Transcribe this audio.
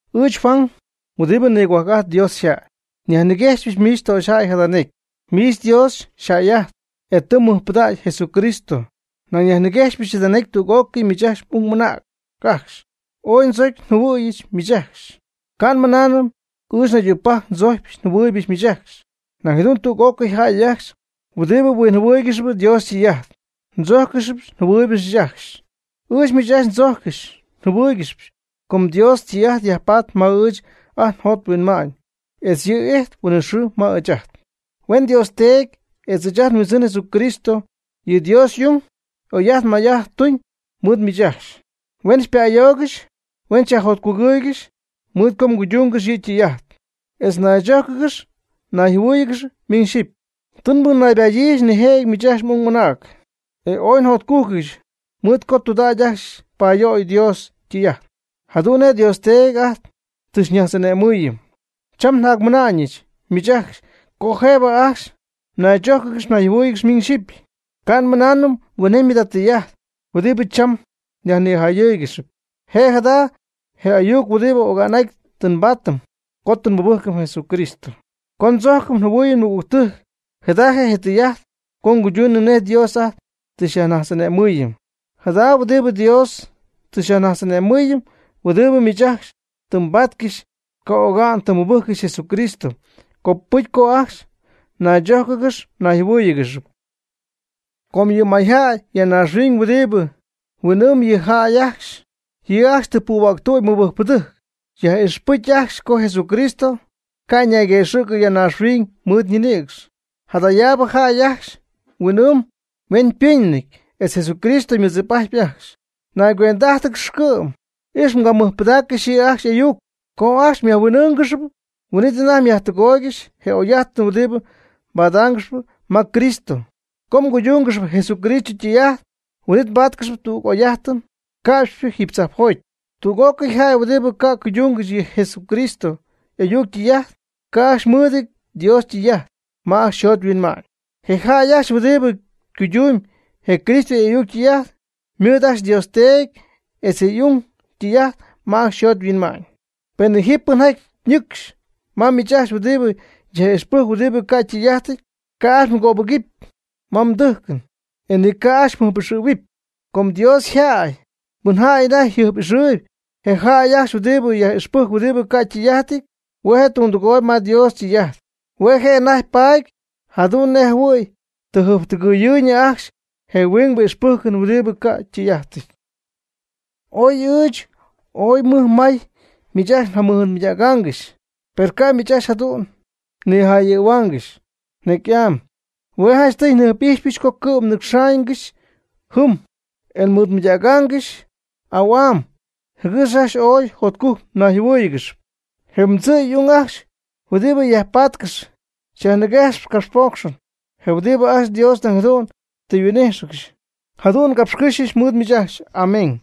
Ɨɨch Juan huɨdibɨ nigohuajc'ajt Dios yjäy. Nyajniguejxpɨch miich töxyjäy jada necy, miich Dios xyjäy'ajtp, e tɨ mmɨjpɨdägy Jesucristo. Nañ nyajniguejxypɨch jada necy tüg'ócɨy miich m'ung m'anäc ajcxy. Ooy ndzocy njɨhuɨ̈yɨch miich ajcxy. Ca' nmɨnaanɨm ɨɨch naydügpajc ndzojcyp njɨhuɨɨybɨch miich ajcxy, nañ jadu'n tüg'ócɨy jäy ajcxy, huɨdibɨ huinjɨhuɨɨygɨxp Dios ytɨy'ajt, xychojccɨxp xyjɨhuɨɨygɨxp ajcxy. Ɨɨch miich ajcxy ndzojccɨxyp njɨhuɨɨygɨxyp com Dios ytɨy'ajt yajpatp ma ɨɨch ajt njot nhuinma'ñ, etz yɨ' ijtp huinɨxɨɨ ma ɨɨch ajt. Huen Dios Teedy etz ɨɨch ajt nHuindzɨn Jesucristo, yɨ Dios y'ung oy'ajt may'ajt tuñ mɨɨd miich ajcxy, huen xypa'ayoogɨxy huen xyajjotcugɨɨygɨxy mɨɨd co mguydungɨxy yɨ' ytɨy'ajt etz mnaychójcɨgɨxy mnayjɨhuɨ́ɨyɨgɨxy miñ xyɨpy. Tɨ nmɨnaybadyiijɨch nijëjɨty miich m'ung m'anäc, e ooy njotcugɨɨyɨch mɨɨd co tɨydudägy ajcxy payöyɨ Dios ytɨy'ajt, jadu'n nej Dios Teedy ajt tɨ xyñajtz'ane'mɨɨyɨm. Cham njacnɨmäyɨch miich ajcxy co jëbɨ ajcxy mnaychójcɨgɨxy mnayjɨhuɨ́ɨyɨgɨxy miñ xyɨpy. Ca' nmɨnaanɨm huinjemy jada tɨy'ajt huɨdibɨ cham nyajnijayɨ́ɨygɨxɨpy. Je' jada je ayuc huɨdibɨ oga'n'aty tɨ nbaatɨm co tɨ nmɨbɨjcɨm Jesucristo. Co ndzojcɨm njɨhuɨɨyɨm nmɨgügtɨjc, jada je' tɨy'ajt co nguyduunɨm nej Dios ajt tɨ xyajnajtz'ane'mɨɨyɨm. Jada huɨdibɨ Dios tɨ xyajnajtz'ane'mɨɨyɨm huɨdibɨ miich ajcxy tɨ mbaatcɨxy, co oga'n tɨ mmɨbɨjccɨxy Jesucristo, copɨcy co ajcxy mnaychójcɨgɨxɨpy mnayjɨhuɨ́ɨyɨgɨxɨpy. Com ji mayjäy ya naaxhuiñ huɨdibɨ huin'ɨɨmb yɨ jäy ajcxy. Yɨ' ajcxy tɨ puhuäctüdy mɨbɨjcpɨdɨjc, yaj'ixpɨjcp ajcxy co Jesucristo ca' ñayguëxɨ̈cɨ ya naaxhuiñ mɨɨd ñinïcx. Jadayaabɨ jäy ajcxy yhuin'ɨɨmyb yhueñypɨnɨty etz Jesucristo ymɨdzip'ajtyp ajcxy. Naygüendɨ'ájtɨgɨx cɨ'm. Ix mgamɨjpɨdaaccɨxy yɨ' ajcxy y'ayuc. Co ajcxy myajhuin'ɨ́ɨngɨxɨpy, huin'it anajty myajtɨgooygɨxy je oy'ajt huɨdibɨ mbadaangɨxyp ma Cristo. Co mguydúngɨxɨpy Jesucristo ytɨy'ajt, huin'it mbáatcɨxɨpy tüg oy'ajt ca'pxypɨ jiiby tzajpjoty. Tüg'ócɨy jäy huɨdibɨ ca' cuydungɨxy je Jesucristo y'ayuc ytɨy'ajt, ca' ajcxy mɨɨdɨty Dios ytɨy'ajt ma ajcxy yjot yhuinma'ñ. Je jäy ajcxy huɨdibɨ cuydundɨɨb je Cristo y'ayuc ytɨy'ajt, ymɨɨd ajcxy Dios Teedy etz je y'ung ytɨy'ajt ma ajcxy yjot yhuinma'ñ. Penɨ ji pɨnjaty ñɨcxy ma miich ajcxy huɨdibɨ yaj'ixpɨjcp huɨdibɨ ca ytɨy'ajtɨty, ca' ajcxy mgöbɨguɨpy ma mdɨjcɨn, e ni ca' ajcxy mjɨjp'ixɨ̈huɨpy. Com Dios yjäy pɨnjaty anajty jɨjp'ixɨɨyb je jäy ajcxy huɨdibɨ yaj'ixpɨjc huɨdibɨ ca' ytɨy'ajtɨty, hue' je' tundɨgooyb ma Dios ytɨy'ajt. Hue' je' anajty paady jadu'n nej jɨhuɨ̈y tɨ jɨjptɨgɨɨyñɨ ajcxy je huingbɨ ixpɨjcɨn huɨdibɨ ca' ytɨy'ajtɨty. Oy ɨɨch ooy mɨj may miich ajcxy njamɨɨdmɨydägaangɨxy per ca' miich ajcxy jadu'n nijayɨ̈huaangɨxy necy'am. Hue' janchtɨy njɨjp'ixyɨch co cɨ'm nninɨcxaangɨxy jɨm, e nmɨɨd mɨydägaangɨxy au'am jɨgɨx ajcxy ooy jotcujc mnayjɨhuɨ́ɨyɨgɨxɨpy. Je mdzɨ' y'ung ajcxy huɨdibɨ ya yajpatcɨxp xyajniguejxp ycapxpocxɨn, je huɨdi ajcxy Dios nañ jadu'n tɨ yhuin'íjxɨgɨxy. Jadu'n ngapxycɨ́xyɨch mɨɨd miich. Amén.